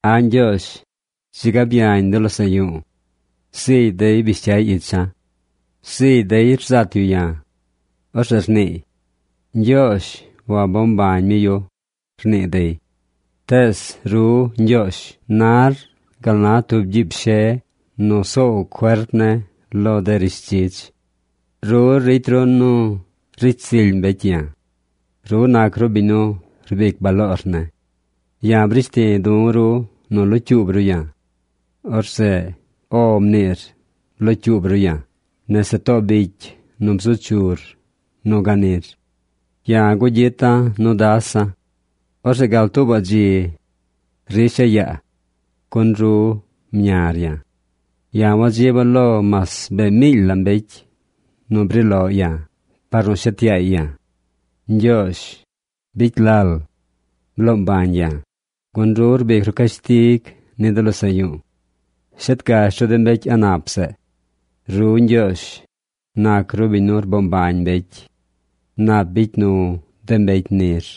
A̱ Ñgyoozh, dzi ga byañ de losaꞌ yu̱u̱. Zigy dey bish cyay icha̱. Zigy dey rzat yu ya̱. Orzeꞌ rniiy: “Ñgyoozh wabo mbañ mi yu”, rnii dey. Tees, ru, Ñgyoozh nar gal na tub gyiib she nu soow cuerp ne̱ lo de rishdzidz. Ru ricy ru nu ricy zily mbecy ya̱. Ru nac ru biñ nu rbic baloor ne̱. Ya̱ brish ti du̱ ru nu locyuub ru ya̱. Orzeꞌ “O” mniir blocyuub ru ya̱ nese too bicy nu bzu chur nu ganir. Ya̱ gugyita̱ nu dasa̱. Orzeꞌ gal tuubaꞌ dzi risha̱ yaa. Gun ru mñar ya̱. Ya̱ wadziba̱ lo mas bee miily la mbecy nu bri loꞌ ya̱ par nu shet yaay ya̱. Ñgyoozh, bicy lal. Bloo mbañ ya̱, gun ru rbic ru cashtig ni de losaꞌ yu̱u̱. Shet gash ru de mbecy a̱ꞌ nap zeꞌ. Ru, Ñgyoozh, nac ru biñ nu rboo mbañ mbecy. Nap bicy nu de mbecy nir.